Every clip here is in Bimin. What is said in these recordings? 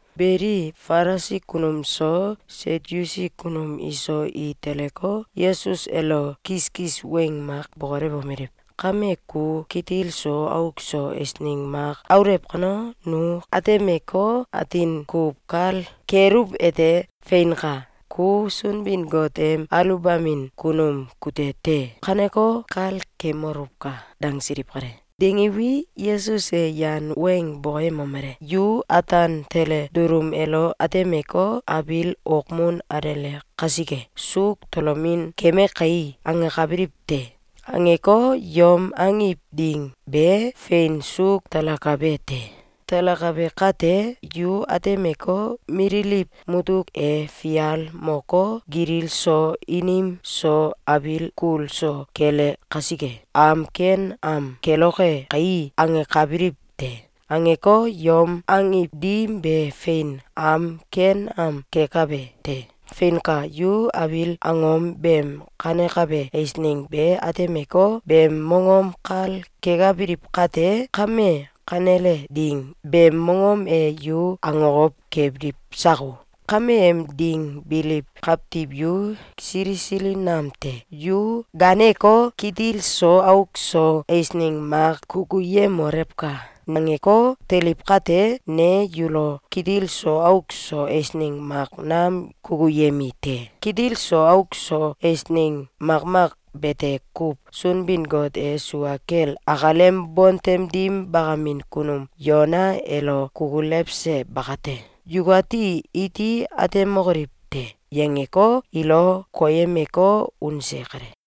Beli, Falisi kunum so Satyusi kunum iso i teleko, Yesus elo kiskis weng mak bokolewomeliw: “Kame ku kitil so auk so eisneng mak aulew kano, nu atemeko, atin kuw kal keluwete: ‘Feinka! Ku Sunbin-Got em aluwbamin kunum kute te!’, kangeko, kal kemoluwka!”, dangsiliw kale. Dangiwi, Yesus e yan weng bokoyemomele: “Yu ataan tele dulum elo atemeko, ‘Abiil okmun alele kasike, suuk tolomin keme kai!’, angenkabiliw te. Angeko, yom angiw ding be fein suuk talakabe te. Talakabe kate, yu atemeko, ‘Mililiw mutuk e fial moko, gilil so inim so abiil kul so kele kasike, am ken am keloke kai.’, angenkabiliw te. Angeko, yom angiw dim be fein am ken am kekabe te. Feinka! Yu abiil angom beem kanekabe eisneng be atemeko, beem mongom kal kekabiliw kate, kame kanele ding beem mongom e yu akokow kebiliw sako? Kameem ding biliw kawtiw yu sili sili nam te. Yu gaaneko, ‘Kitil so auk so eisneng mak kukuyemolewka!’, nangeko, teliw kate, ne yulo kitil so auk so eisneng mak nam kukuyemi te. Kitil so auk so eisneng makmak bete kuw Sunbin-Got e sua kel akalem bontem dim bakamin kunum Yona elo kukulewse bakate, yukati iti atemokoliw te.”, yangeko, ilo koyemeko, unse kale.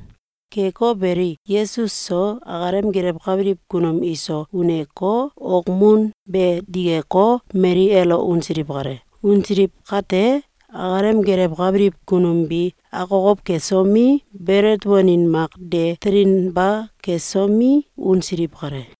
Keko beli, Yesus so akalem gelewkabiliw kunum iso uneko, okmun be dikeko, mali elo unsiliw kale. Unsiliw kate, akalem gelewkabiliw kunum bi akokow kesomi, belet wanin mak de telinba kesomi, unsiliw kale.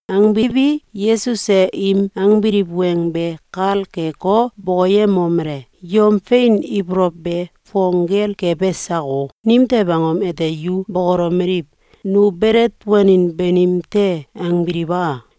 Angbiwi, Yesus e im angbiliw weng be kal keko, bokoyemomele: “Yom fein ibolow be fong gel kebe sako? Nimtew angom ete yu bokolomeliw: ‘Nu belet wanin banim te!’, angbiliw a?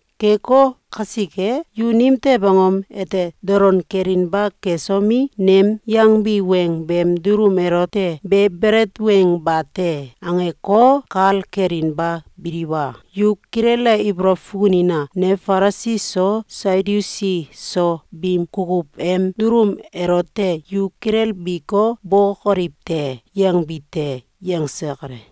Keko kasike, yu nimtew angom ete dolon kelinba kesomi, nem yangbi weng beem dulum elote ‘Be belet weng bate!’, angeko, kal kelinba biliw a? Yu kilele ibolow fukunina! Ne Falisi so Satyusi so biim kukuw em dulum elote ‘Yu kilelbiko, bokoliw te!’, yangbi te.”, yangse kale.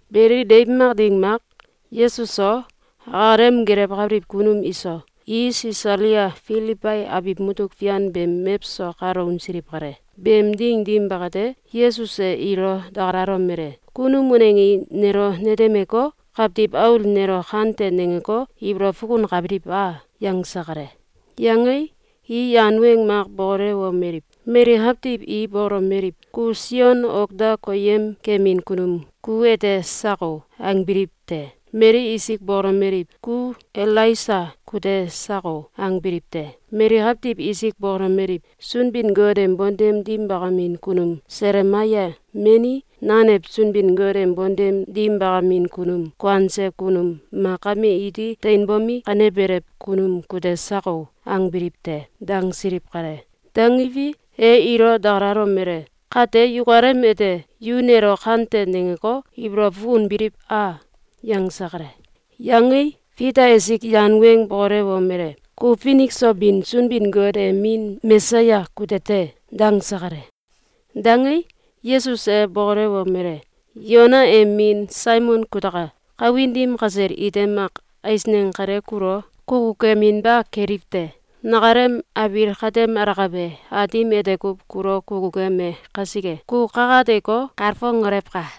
Beli, deiw mak ding mak, Yesus so, akalem gelewkabiliw kunum iso, i Sisalia Filibai abiw mutuk fian beem mewso kalo unsiliw kale. Beem ding dim bakate, Yesus e ilo dakalalomele: “Kunum waneng i nelo netemeko, Kawtiw Aul nelo kante nangeko, ibolow fukunkabiliw a?”, yangse kale. Yangei, i yan weng mak bokolewomeliw: “Mali kawtiw i bokolomeliw: ‘Ku Sion ok da koyemkemin kunum ku ete sako!’, angbiliw te. Mali isik bokolomeliw: ‘Ku Elaisa kute sako!’, angbiliw te. Mali kawtiw isik bokolomeliw: ‘Sunbin-Got em bontem dim bakamin kunum Selemaya meni nanew Sunbin-Got em bontem dim bakamin kunum kuanse kunum mak kame iti teinbomi, kanebelew kunum kute sako!’, angbiliw te.”, dangsiliw kale. Dangiwi, e ilo dakalalomele: “Kate yukalem ete, yu nelo kante nangeko, ibolow fukunbiliw a?”, yangse kale. Yangei, Fita esik yan weng bokolewomele: “Ku finik so bin Sunbin-Got em Min Mesaya kute te!”, dangse kale. Dangei, Yesus e bokolewomele: “Yona em min Saimon kutaka! Kawin dim kasel ite mak eisneng kale kulo kukukeminba keliw te. Nakalem abiil katem alakabe Aatim ete kuw kulo kukukeme kasike, ku kakateko, kalfongolewka!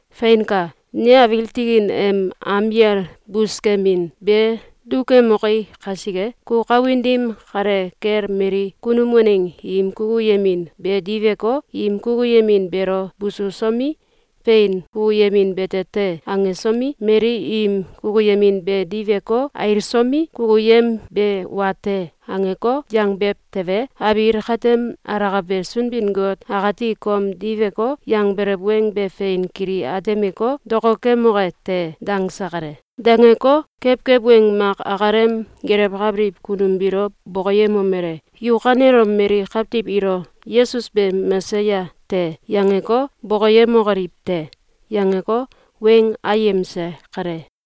Feinka! Ne abiil tikin em am yal buskemin be dukemoki kasike, ku kawin dim kale kel mali kunum waneng im kukuyemin be diweko, im kukuyemin beelo bususomi, ‘Fein kukuyemin bete te!’, angesomi, mali im kukuyemin be diweko, ailsomi, ‘Kukuyem be wa te!’, angeko, yangbew tewe, abiil katem alakabe Sunbin-Got akati kom diweko, yangbelew weng be fein kili atemeko, dokokemoke te.”, dangse kale. Dangeko, kewkew weng mak akalem gelewkabiliw kunum biilo bokoyemomele: “Yu kanelom mali kawtiw ilo ‘Yesus be Mesaya te!’, yangeko, bokoyemokoliw te!”, yangeko, weng ayemse kale.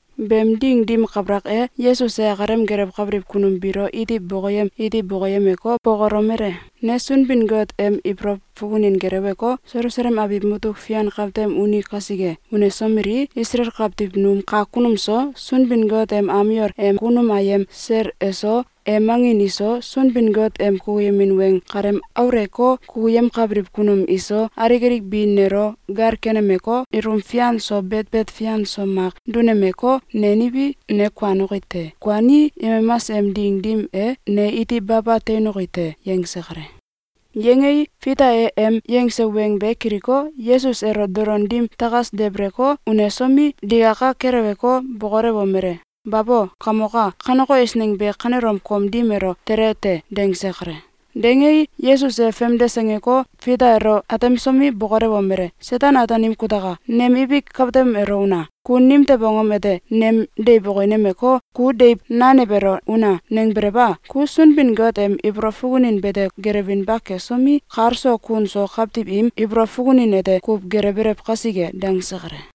Beem ding dim kabalak e, Yesus e akalem gelewkabiliw kunum biilo iti bokoyem iti bokoyemeko, bokolomele: “Ne Sunbin-Got em ibolow fukunin geleweko, Selusalem abiw mutuk fian kawtem uni kasike. Unsomelii, Isalael kawtiw num kak kunum so, Sunbin-Got em am yol em kunum ayem sel eso, em angin iso, Sunbin-Got em kukuyemin weng kalem aulewko, kukuyemkabiliw kunum iso, alik alik bi nelo gal kenemeko, ilum fian so betbet fian so mak dunemeko, neniwi, ne kuanoki te. Kuanii, yemamas em ding dim e, ne iti baba teinoki te.”, yangse kale. Yangei, Fita e em yangse weng be kiliko, Yesus elo dolon dim takas debeleko, unesomi, digaka keleweko, bokolewomele: “Babo! Kamok a! Kaneko eisneng be kanelom kom dim elo tele te!”, dangse kale. Dangei, Yesus e famdes angeko, Fita elo atemsomi, bokolewomele: “Seten-Ataanim kutaka! Nem ibik katem elo una! Ku nimtew angom ete nem deiw okinemeko, ‘Ku deiw nanew elo una!’, nangbelew a? Ku Sunbin-Got em ibolow fukunin bete gelewinba kesomi, kal so kun so kawtiw im ibolow fukunin ete kuw gelewbelew kasike!”, dangse kale.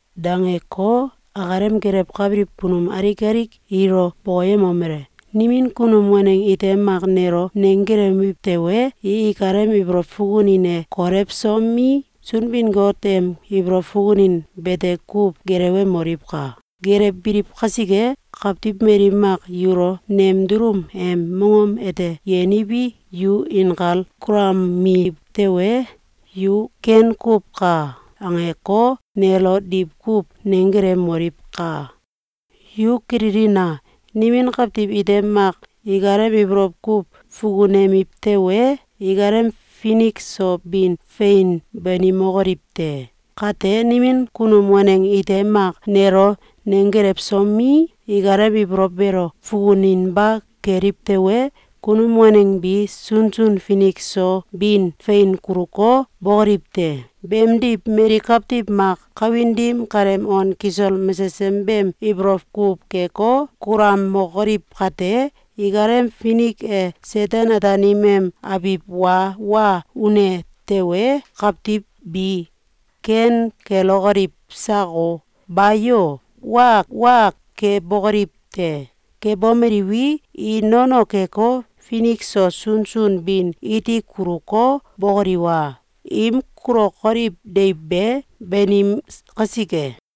Dangeko, akalem gelewkabiliw kunum alik alik ilo bokoyemomele: “Nimin kunum waneng ite mak nelo nenggelewiw tewe, i ikalem ibolow fukunin e kolewsomi, Sunbin-Got em ibolow fukunin bete kuw gelewemoliwka! Gelewbiliw kasike, kawtiw mali mak yulo nem dulum em mongom ete yenewi, yu inkal kulamiw tewe, yu ‘Ken kuw ka!’, angeko, nelo diwkuw nenggelewmoliwkam Yu kililina! Nimin kawtiw ite mak ikalem ibolow kuw fukunemiw tewe, ikalem finik so bin fein banimokoliw te. Kate, nimin kunum waneng ite mak nelo nenggelewsomi, ikalem ibolow beelo fukuninba keliw tewe, kunum waneng bi sunsun finik so bin fein kuluko, bókoliw te. Beemdiw, mali kawtiw mak kawin dim kaleem on kisol mesesem beem ibolow kuw keko, kulamokoliw kate, ikalem finik e Seten-Ataanim em abiw wa wa une tewe, kawtiw bi ken kelokoliw sako? Bayo! Wa wa kebokoliw te. Kebomeliwi, i nono keko, finik so sunsun bin iti kuluko, bókoliw a? Im kulokoliw deiw be banim kasike!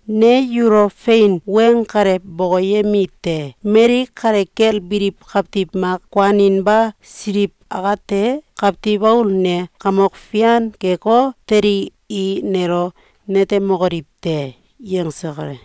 Ne yulo fein weng kale bokoyemite: Mali kale kel biliw kawtiw mak kuaninba siliw akate, Kawtiw Aul ne kamok fian keko, telii, i nelo netemokiliw te.”, yangse kale.